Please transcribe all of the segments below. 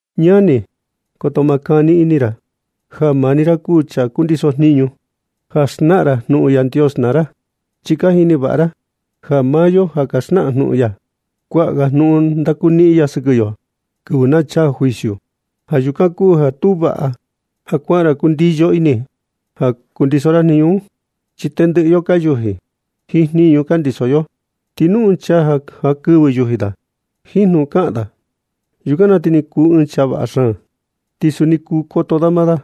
Ñani, koto ma kani ini ra ja ra maa ni ra kuu chaa kundiso jniñu ja xnaꞌan ra jnuꞌun Yandios naa ra. Chi ka jini vaꞌa ra ja maa yo ja ka xnaꞌan jnuꞌun ya, kuaꞌa ga jnuꞌun ndakuniꞌin ya sɨkɨ yo kɨvɨ na chaa juicio. Ja yukan kuu ja tu vaꞌa ja kuaꞌa ra kundiyo ini ja kundiso ra jniñu un. Chi tendɨꞌɨ yo ka yuji jiin jniñu ka ndiso yo. Ti nu ɨɨn chaa ja jankɨvɨ yuji da jiin jnuꞌun kaꞌan da, yukan na ti kuu ɨɨn chaa vaꞌa xaan. Ti suni kuu koto da maa da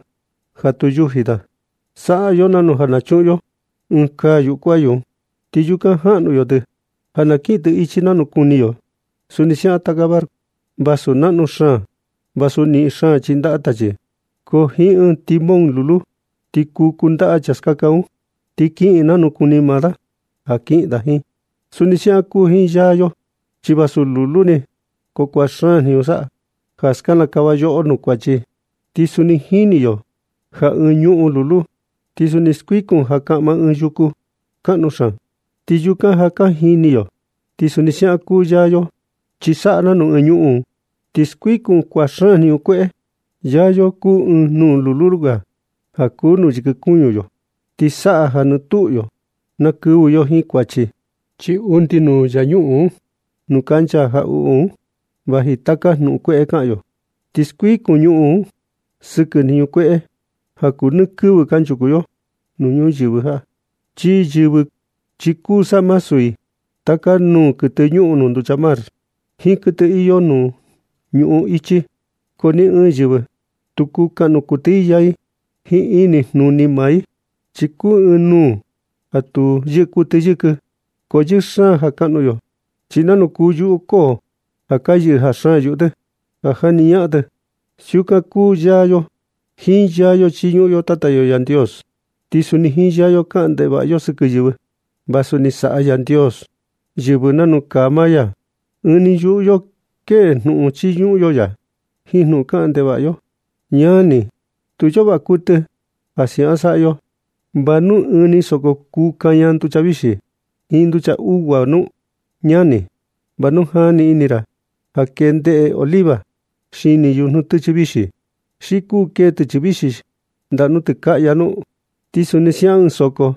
ja tu yuji da. Saꞌa yo nanu ja nu na chuꞌun yo ɨɨn kaa yuꞌu kuayu, ti yukan jaꞌnu yo tɨ ja na kiꞌin tɨ ichi nanu kuni yo. Suni siaꞌan taka barco, vasu naꞌnu xaan, ti vasu niꞌin xaan chindaꞌa tachi, ko jiin ɨɨn timón lulu ni ti kuu kundaꞌa chaa skaka un, ti kiꞌin nanu kuni maa da ja kiꞌin da jiin. Suni siaꞌan kuu jiin yaa yo, chi vasu lulu ni, ko kuaꞌa xaan jniñu saꞌa ja skinikava yoꞌo nuu kuachi. Ti suni jini yo ja ɨɨn ñuꞌun lulu ni, ti kuu skuikun ja kaꞌma ɨɨn yuku kaꞌnu xaan. Ti yukan ja ka jini yo. Ti suni siaꞌan kuu yaa yo, chi saꞌa nanu ɨɨn ñuꞌun, chi skuikun kuaꞌa xaan jniñu kueꞌe. Yaa yo kuu ɨɨn nuu lulu ga ja kuu nuu yɨkɨ kuñu yo, ti saꞌa ja nɨ tuꞌu yo na kɨvɨ yo jiin kuachi. Chi undi nuu yaa ñuꞌun nuu kancha jaꞌuꞌu un vaji taka jnuꞌun kueꞌe kaꞌan yo, ti skuikun ñuꞌun sɨkɨ jniñu kueꞌe ja kuu nɨ kɨvɨ kanchuku yo nuu ñuyɨvɨ jaꞌa. Ti yɨvɨ chi kuu samasu i taka nuu kuɨtɨ ñuꞌun nuu nducha mar, jiin kuɨtɨ iyo nuu ñuꞌun ichi, ko ni ɨɨn yɨvɨ tu kuu kaꞌnu kuɨtɨ i yaa i jiin ini jnuni maa i. Chi kuu ɨɨn nuu ja tu yɨꞌɨ kuɨtɨ yɨkɨ, ko yɨɨ xaan ja kaꞌnu yo. Ti nanu kuu yuꞌu koo ja ka yɨꞌɨ jaa xaan yuꞌu tɨ ja jaꞌni ñaꞌan tɨ, siukan kuu yaa yo. Jiin yaa yo chiñuꞌun yo Tata yo Yandios, ti suni jiin yaa yo kaꞌan ndevaꞌa kuɨtɨ yo sɨkɨ yɨvɨ, vasu ni saꞌa Yandios yɨvɨ nanu kaa maa ya. Ɨɨn ni yuꞌu yo kee jnuꞌun chiñuꞌun yo ya jiin jnuꞌun kaꞌan ndevaꞌa yo. Ñani, tu iyo vaꞌa kuɨtɨ ja siukan saꞌa yo. ¿Va nu ɨɨn ni soko kuu kaña nducha vixi jiin nducha ugua nu? Ñani, ¿va nu jani ini ra ja kee ndeꞌe oliva xini yujnu tɨchɨ vixi, xi kuu kee tɨchɨ vixi ndaꞌa nuu tɨkaꞌya nu? Ti suni siaꞌan ɨɨn soko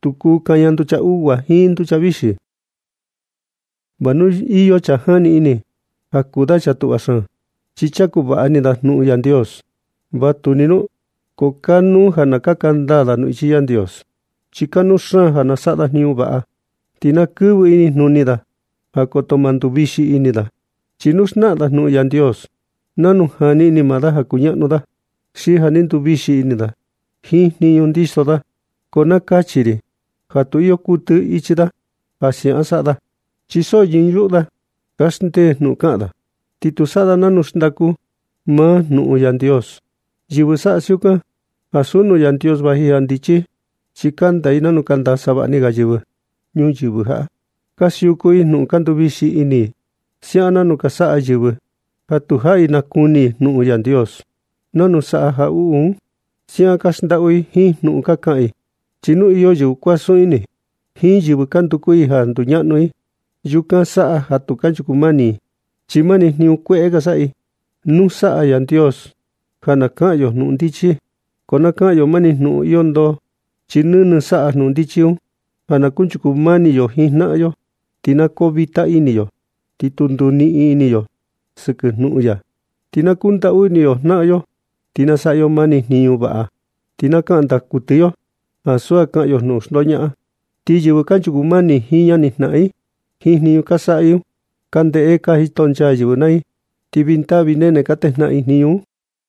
tu kuu kaña nducha ugua jiin nducha vixi. Va nu iyo chaa jani ini ja kuu da chaa tuꞌva xaan, chi chaku vaꞌa ini da jnuꞌun Yandios. Vatuni un, ko kanuu ja na kaka ndaa da nuu ichi Yandios. Chi kanuu xaan ja na saꞌa da jniñu vaꞌa. Ti na kɨvɨ inijnuni da ja koto ma nduvixi ini da. Chi nu xnaꞌan da jnuꞌun Yandios nanu jani ini maa da ja kuñaꞌnu da, xi ja ni nduvixi ini da jiin jniñu ndiso da, ko na kachi ri ja tu iyo kuɨtɨ ichi da ja siaꞌan saꞌa da. Chi so ñɨɨ yuꞌu da kaxndee jnuꞌun kaꞌan da, ti tu saꞌa da nanu xndaku maa jnuꞌun Yandios. Yɨvɨ saꞌa siukan, ansu nuu Yandios vaji ja ndichi i. Chi kanda i nanu kanda savaꞌni ga yɨvɨ ñuyɨvɨ jaꞌa. Ka siuku i jnuꞌun ka nduvixi ini siaꞌan nanu ka saꞌa yɨvɨ ja tu jaꞌi nakuni i jnuꞌun Yandios. Nanu saꞌa jaꞌuꞌu un, siaꞌan ka xndaꞌu i jiin jnuꞌun ka kaꞌan i. Chi nu iyo yɨvɨ kuasun ini jiin yɨvɨ ka nduku i ja nduñaꞌnu i, yukan saꞌa ja tu kanchuku mani i, chi mani jniñu kueꞌe ka saꞌa i. Nu saꞌa Yandios ja na kaꞌan yo jnuꞌun ndichi, ko na kaꞌan yo mani jnuꞌun iyo ndoo. Chi nɨnɨ saꞌa jnuꞌun ndichi un ja na kunchuku mani yo jiin jnaꞌan yo, ti na koo vita ini yo, ti tu nduniꞌin ini yo sɨkɨ jnuꞌun ya. Ti na kundaꞌu ini yo jnaꞌan yo, ti na saꞌa yo mani jniñu vaꞌa. Ti na kaꞌan ndaa kuɨtɨ yo, ansu ja kaꞌan yo jnuꞌun xndoñaꞌan. Ti yɨvɨ kanchuku mani jiin ñani jnaꞌan i, jiin jniñu ka saꞌa i un ka ndeꞌe ka jito nchaa yɨvɨ naa i, ti vii ndaa vii nene ka natejnaꞌan i jniñu un.